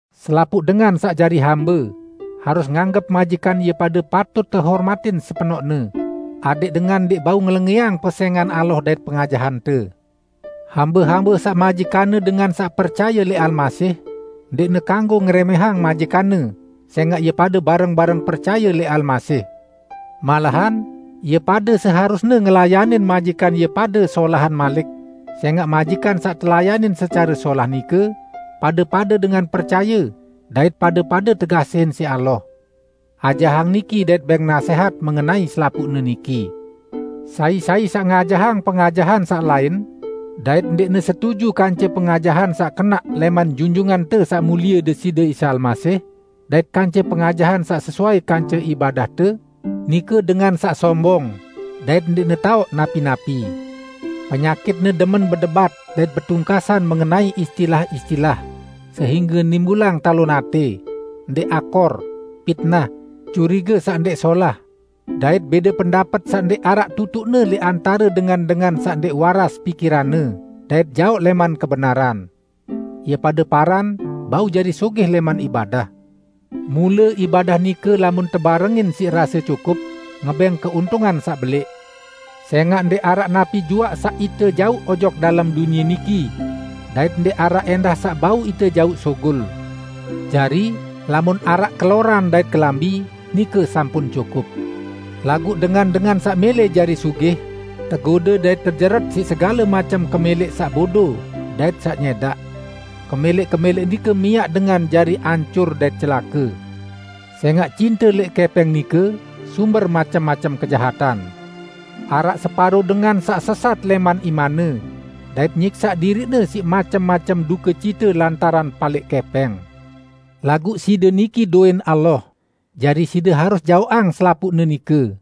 Selapuq dengan saq jari hambe, harus nganggep majikan ie pade patut tehormatin sepenoqne, adẽq dengan ndẽq bau ngelengẽang pesẽngan Allah dait pengajahante. Hambe-hambe saq majikanne dengan saq percaye lẽq Almasih, ndẽqne kanggo ngerẽmẽhang majikanne sẽngaq ie pade bareng-bareng percaye lẽq Almasih. Malahan ie pade seharusne ngelayanin majikan ie pade solahan malik, sẽngaq majikan saq telayanin secare solah nike pade-pade dengan percaye dait pade-pade tekasihin siq Allah. Ajahang niki dait bẽng nasẽhat mengenai selapuqne niki. Sai-sai saq ngajahang pengajahan saq lain dait ndẽqne setuju kance pengajahan saq kenaq lẽman Junjungante Saq Mulie Deside Isa Almasih, dait kance pengajahan saq sesuai kance ibadahte, nike dengan saq sombong, dait ndẽqne taoq napi-napi! Penyakitne demen bedebat dait betungkasan mengenai istilah-istilah sehingge nimbulang talon atẽ, ndẽq akor, pitnah, curige saq ndẽq solah, dait bẽde pendapet saq ndẽq araq tutuqne lẽq antare dengan-dengan saq ndẽq waras pikiranne dait jaoq lẽman kebenaran. Ie pade paran bau jari sugih lẽman ibadah. Mule ibadah nike lamun tebarengin siq rase cukup ngebẽng keuntungan saq belẽq. Sẽngaq ndẽq araq napi juaq saq ite jauq ojok dalem dunie niki, dait ndẽq araq ẽndah saq bau ite jauq sugul! Jari, lamun araq keloran dait kelambi, nike sampun cukup. Laguq dengan-dengan saq mẽlẽ jari sugih, tegode dait tejeret siq segale macem kemẽlẽq saq bodo dait saq nyẽdaq. Kemẽlẽq-kemẽlẽq nike miaq dengan jari ancur dait celake. Sẽngaq cinte lẽq kẽpẽng nike sumber macem-macem kejahatan. Araq separo dengan saq sesat lẽman imanne dait nyiksaq diriqne siq macem-macem dukecite lantaran palẽq kẽpẽng. Laguq side niki dowẽn Allah, jari side harus jaoqang selapuqne nike.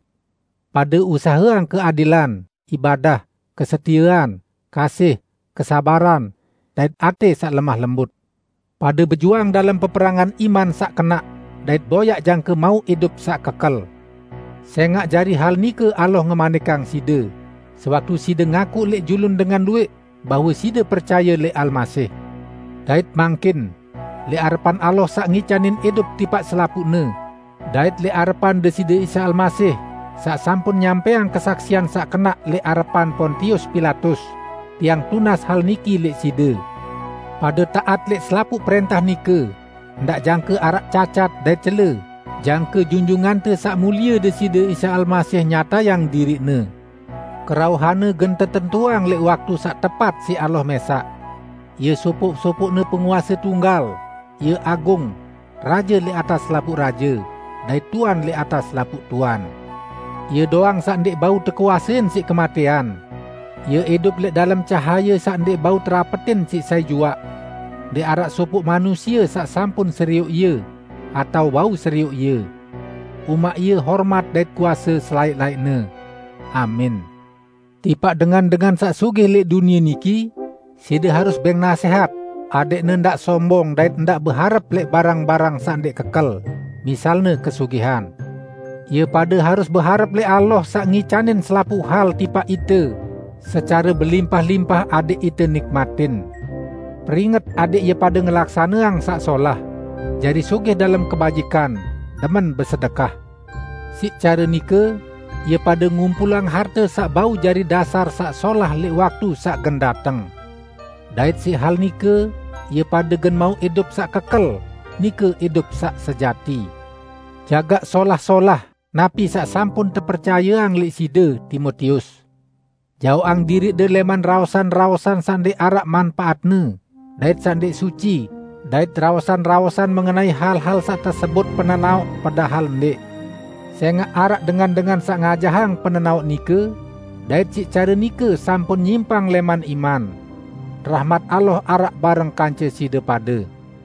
Pade usaheang keadilan, ibadah, kesetiean, kasih, kesabaran, dait atẽ saq lemah lembut. Pade bejuang dalem peperangan iman saq kenaq dait boyaq jangke mauq idup saq kekel. Sẽngaq jari hal nike Allah ngemanikang side, sewaktu side ngakuq lẽq julun dengan luwẽq bahwe side percaye lẽq Almasih. Dait mangkin, lẽq arepan Allah saq ngicanin idup tipaq selapuqne, dait lẽq arepan Deside Isa Almasih saq sampun nyampẽang kesaksian saq kenaq lẽq arepan Pontius Pilatus, tiang tunas hal niki lẽq side: Pade taat lẽq selapuq prẽntah nike, ndaq jangke araq cacat dait cele jangke Junjungante Saq Mulie Deside Isa Almasih nyatayang diriq-Ne. Kerauhan-Ne gen tetentuang lẽq waktu saq tepat siq Allah mẽsaq. Ie sopoq-sopoqne Penguase tunggal; Ie agung, Raje lẽq atas selapuq raje, dait Tuan lẽq atas selapuq tuan. Ie doang saq ndẽq bau tekuasein siq kematẽan; Ie idup lẽq dalem cahaye saq ndẽq bau terapetin siq sai juaq. Ndẽq araq sopoq manusie saq sampun serioq Ie, atao bau serioq Ie. Umaq Ie hormat dait kuase selaẽq-laẽqne! Amin. Tipaq dengan-dengan saq sugih lẽq dunie niki, side harus bẽng nasẽhat adẽqne ndaq sombong dait ndaq beharep lẽq barang-barang saq ndẽq kekel -- misalne kesugihan. Ie pade harus beharep lẽq Allah saq ngicanin selapuq hal tipaq ite secare belimpah-limpah adẽq ite nikmatin. Peringet adẽq ie pade ngelaksaneang saq solah, jari sugih dalem kebajikan, demen besedekah. Siq care nike ie pade ngumpulang harte saq bau jari dasar saq solah lẽq waktu saq gen dateng. Dait siq hal nike ie pade gen mauq idup saq kekel, nike idup saq sejati. Jagaq solah-solah napi saq sampun tepercayeang lẽq side, Timotius! Jaoqang diriqde lẽman raosan-raosan saq ndẽq araq manpaatne dait saq ndẽq suci dait raosan-raosan mengenai hal-hal saq tesebut penenaoq padahal ndẽq. Sẽngaq araq dengan-dengan saq ngajahang penenaoq nike dait siq care nike sampun nyimpang lẽman iman. Rahmat Allah araq bareng kance side pade!